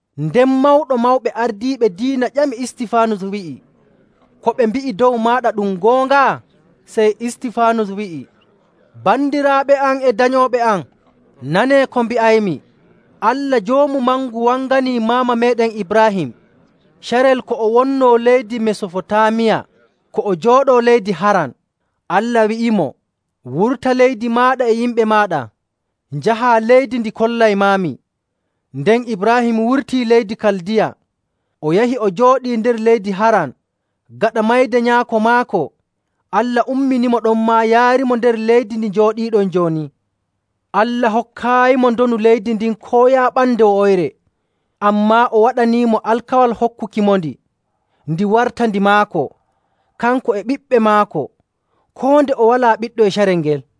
Nden Mawɗo Mawɓe Ardiiɓe Diina ƴami Istifaanus wi'i, “Ko ɓe mbi'i dow maaɗa ɗum goonga?” Sey Istifaanus wi'i, “Bandiraaɓe am e danyooɓe am, nanee ko mbi'aymi! Allah Joomu Mangu wanganii maama meeɗen Ibraahim carel ko o wonnoo leydi Mesofotaamiya, ko o jooɗoo leydi Haran. Allah wi'imo, ‘Wurta leydi maaɗa e yimɓe maaɗa, njahaa leydi ndi kollaymaami.’. Nden Ibraahim wurtii leydi Kaldiya, o yahi o jooɗii nder leydi Haran. Gaɗa mayde nyaako maako, Allah umminimo ɗonmaa yaarimo nder leydi ndi njooɗiiɗon jooni.. Allah hokkaayimo ndonu leydi ndin koo yaaɓande wo'oyre, ammaa o waɗaniimo alkawal hokkukimondi, ndi warta ndi maako, kanko e ɓiɓɓe maako, koo nde o walaa ɓiɗɗo e carel ngel..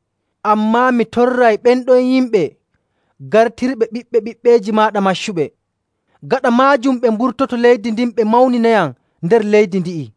Ammaa mi torray ɓen ɗon yimɓe gartirɓe Ɓiɓɓe ɓiɓɓeeji maaɗa maccuɓe. Gaɗa maajum ɓe mburtoto leydi ndin ɓe mawninayam nder leydi ndi'i.’..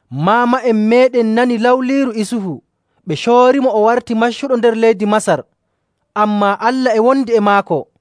“Maama'en meeɗen nani lawliiru Isufu, ɓe coorimo o warti maccuɗo nder leydi Masar. Ammaa Allah e wondi e maako,.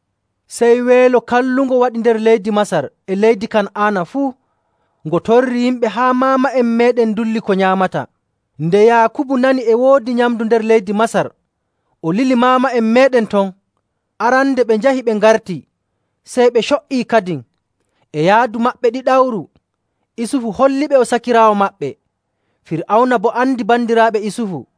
Sey weelo kallungo waɗi nder leydi Masar e leydi Kan'aana fuu. Ngo torri yimɓe haa maama'en meeɗen ndulli ko nyaamata.. Nde Yaakubu nani e woodi nyamndu nder leydi Masar, o lili maama'en meeɗen ton. Arande ɓe njahi ɓe ngarti, sey ɓe co''ii kadin. E yaadu maɓɓe ɗiɗawru, Isufu holliɓe o sakiraawo maɓɓe. Fir'awna boo andi bandiraaɓe Isufu..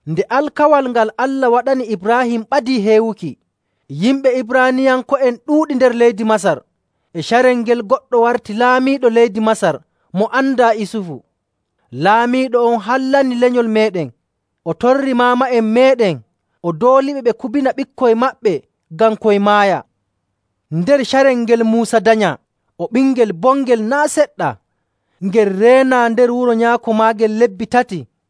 “Nde alkawal ngal Allah waɗani Ibraahim ɓadii heewuki, yimɓe Ibraaniyanko'en ɗuuɗi nder leydi Masar. E carel ngel goɗɗo warti laamiiɗo leydi Masar mo andaa Isufu.. Laamiiɗo on hallani lenyol meeɗen, o torri maama'en meeɗen o dooliɓe ɓe kubina ɓikkoy maɓɓe ngam koy maaya.. Nder carel ngel Muusa danyaa, o ɓingel bongel naa' seɗɗa. Ngel reenaa nder wuro nyaako maagel lebbi tati..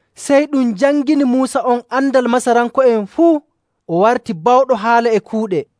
Sey ɗum jangini Muusa on andal Masaranko'en fuu, o warti bawɗo haala e kuuɗe.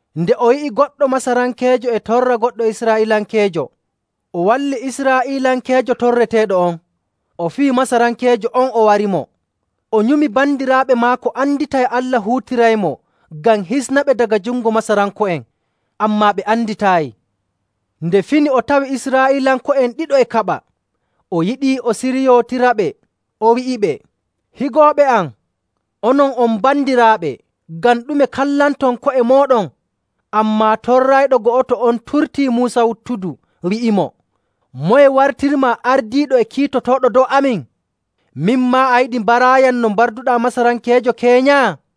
Nde o yi'i goɗɗo Masarankeejo e torra goɗɗo Israa'iilankeejo, o walli Israa'iilankeejo torreteeɗo on, o fiyi Masarankeejo on, o warimo. O nyumi bandiraaɓe maako anditay Allah huutiraymo ngam hisnaɓe daga jungo Masaranko'en, ammaa ɓe anditaayi. Nde fini o tawi Israa'iilanko'en ɗiɗo e kaɓa. O yiɗii o siryootiraɓe, o wi'iɓe, ‘Higooɓe am, onon on bandiraaɓe! Ngam ɗume kallanton ko'e mooɗon?’ Ammaa torrayɗo go'oto on turtii Muusa wuttudu, wi'imo, ‘Moye wartirmaa ardiiɗo e kiitotooɗo dow amin? Min maa, a yiɗi mbaraayam no mbarduɗaa Masarankeejo keenya?’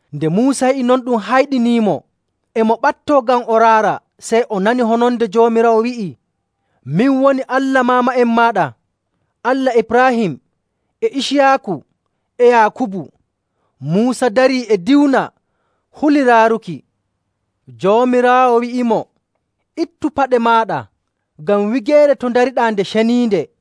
Nde Muusa yi'i non ɗum hayɗiniimo, e mo ɓattoo ngam o raara, sey o nani hononde Joomiraawo wi'ii, ‘Min woni Allah maama'en maaɗa, Allah Ibraahim e Iciyaaku e Yaakubu.’ Muusa darii e diwna, huli raaruki. Joomiraawo wi'imo, ‘Ittu paɗe maaɗa, ngam wigeere to ndariɗaa nde ceniinde.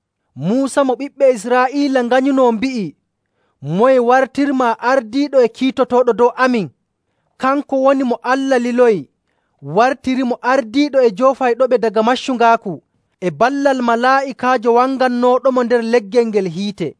“Muusa mo ɓiɓɓe Israa'iila nganyunoo mbi'i, ‘Moye wartirmaa ardiiɗo e kiitotooɗo dow amin?’ Kanko woni mo Allah liloyi, wartirimo ardiiɗo e joofayɗoɓe daga maccungaaku e ballal malaa'ikaajo wangannooɗomo nder leggel ngel hiite..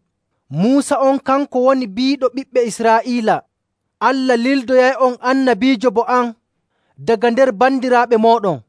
Muusa on kanko woni biiɗo ɓiɓɓe Israa'iila, ‘Allah lildoyay'on annabiijo bo am, daga nder bandiraaɓe mooɗon.’.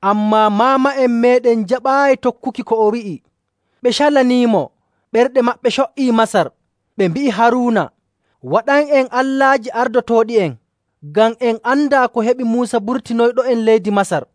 “Ammaa maama'en meeɗen njaɓaayi tokkuki ko o wi'i. Ɓe calaniimo, ɓerɗe maɓɓe co''ii Masar. Ɓe mbi'i Haruuna, ‘Waɗan'en allaaji ardotooɗi'en, ngam en andaa ko heɓi Muusa burtinoyɗo'en leydi Masar.’.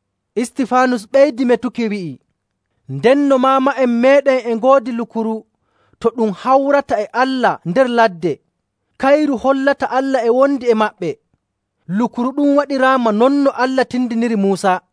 Istifaanus ɓeydi metuki, wi'i, “Ndenno maama'en meeɗen e ngoodi Lukuru To Ɗum Hawrata e Allah nder ladde. Kayru hollata Allah e wondi e maɓɓe. Lukuru ɗum waɗiraama non no Allah tindiniri Muusa..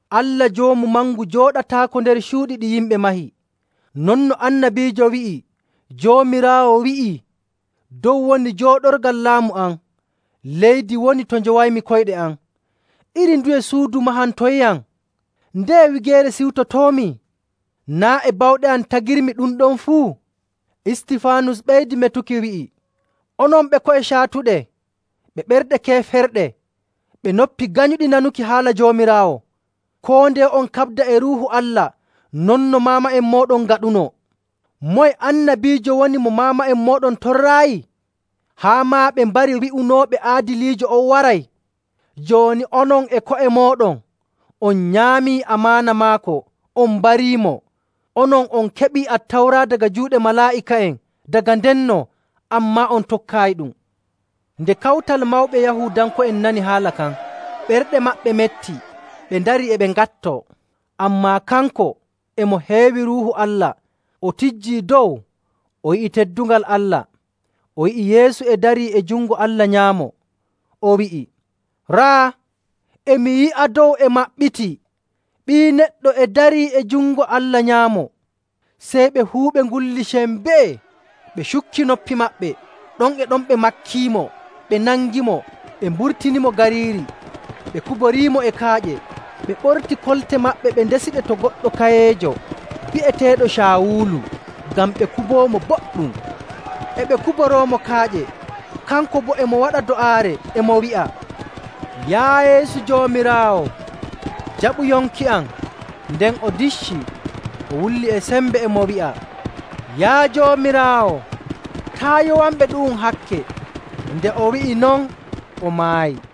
“Allah Joomu Mangu jooɗataako nder cuuɗi ɗi yimɓe mahi, non no annabiijo wi'i Joomiraawo wi'ii, ‘Dow woni jooɗorgal laamu am, leydi woni to njowaymi koyɗe am. Iri nduye suudu mahantonyam? Ndeye wigeere ciwtotoomi? Naa' e bawɗe am tagirmi ɗum ɗon fuu?’”. Istifaanus ɓeydi metuki, wi'i, “Onon ɓe ko'e caatuɗe ɓe ɓerɗe keeferɗe, ɓe noppi ganyuɗi nanuki haala Joomiraawo! Koo ndeye on kaɓda e Ruuhu Allah non no maama'en mooɗon ngaɗunoo.. Moye annabiijo woni mo maama'en mooɗon torraayi? Haa maa ɓe mbarii wi'unooɓe Aadiliijo on waray. Jooni onon e ko'e mooɗon on nyaamii amaana maako, on mbariimo. Onon on keɓii Attawra daga juuɗe malaa'ika'en daga ndenno, ammaa on tokkaayiɗum.” Nde kawtal mawɓe Yahuudanko'en nani haala kan, ɓerɗe maɓɓe metti ɓe ndarii e ɓe ŋattoo. Ammaa kanko, e mo heewi Ruuhu Allah, o tijjii dow o yi'i teddungal Allah, o yi'i Yeesu e darii e jungo Allah nyaamo. O wi'i, “Raa! E mi yi'a dow e maɓɓitii, Ɓii Neɗɗo e darii e jungo Allah nyaamo.” Sey ɓe fuu ɓe ngulli sembee, ɓe cukki noppi maɓɓe. Ɗon e ɗon, ɓe makkiimo, ɓe nangimo, ɓe mburtinimo gariiri, ɓe kuboriimo e kaaƴe, ɓe ɓortii kolte maɓɓe ɓe ndesiɗe to goɗɗo kayeejo bi'eteeɗo Caawulu ngam ɓe kuboomo boɗɗum. E ɓe kuboroomo kaaƴe, kanko boo e mo waɗa do'aare e mo wi'a, “Yaa Yeesu Joomiraawo, jaɓu yonki am!” Nden o diccii, o wulli e sembe e mo wi'a, “Yaa Joomiraawo, taa' yowanɓe ɗu'um hakke!” Nde o wi'i non, o maayi.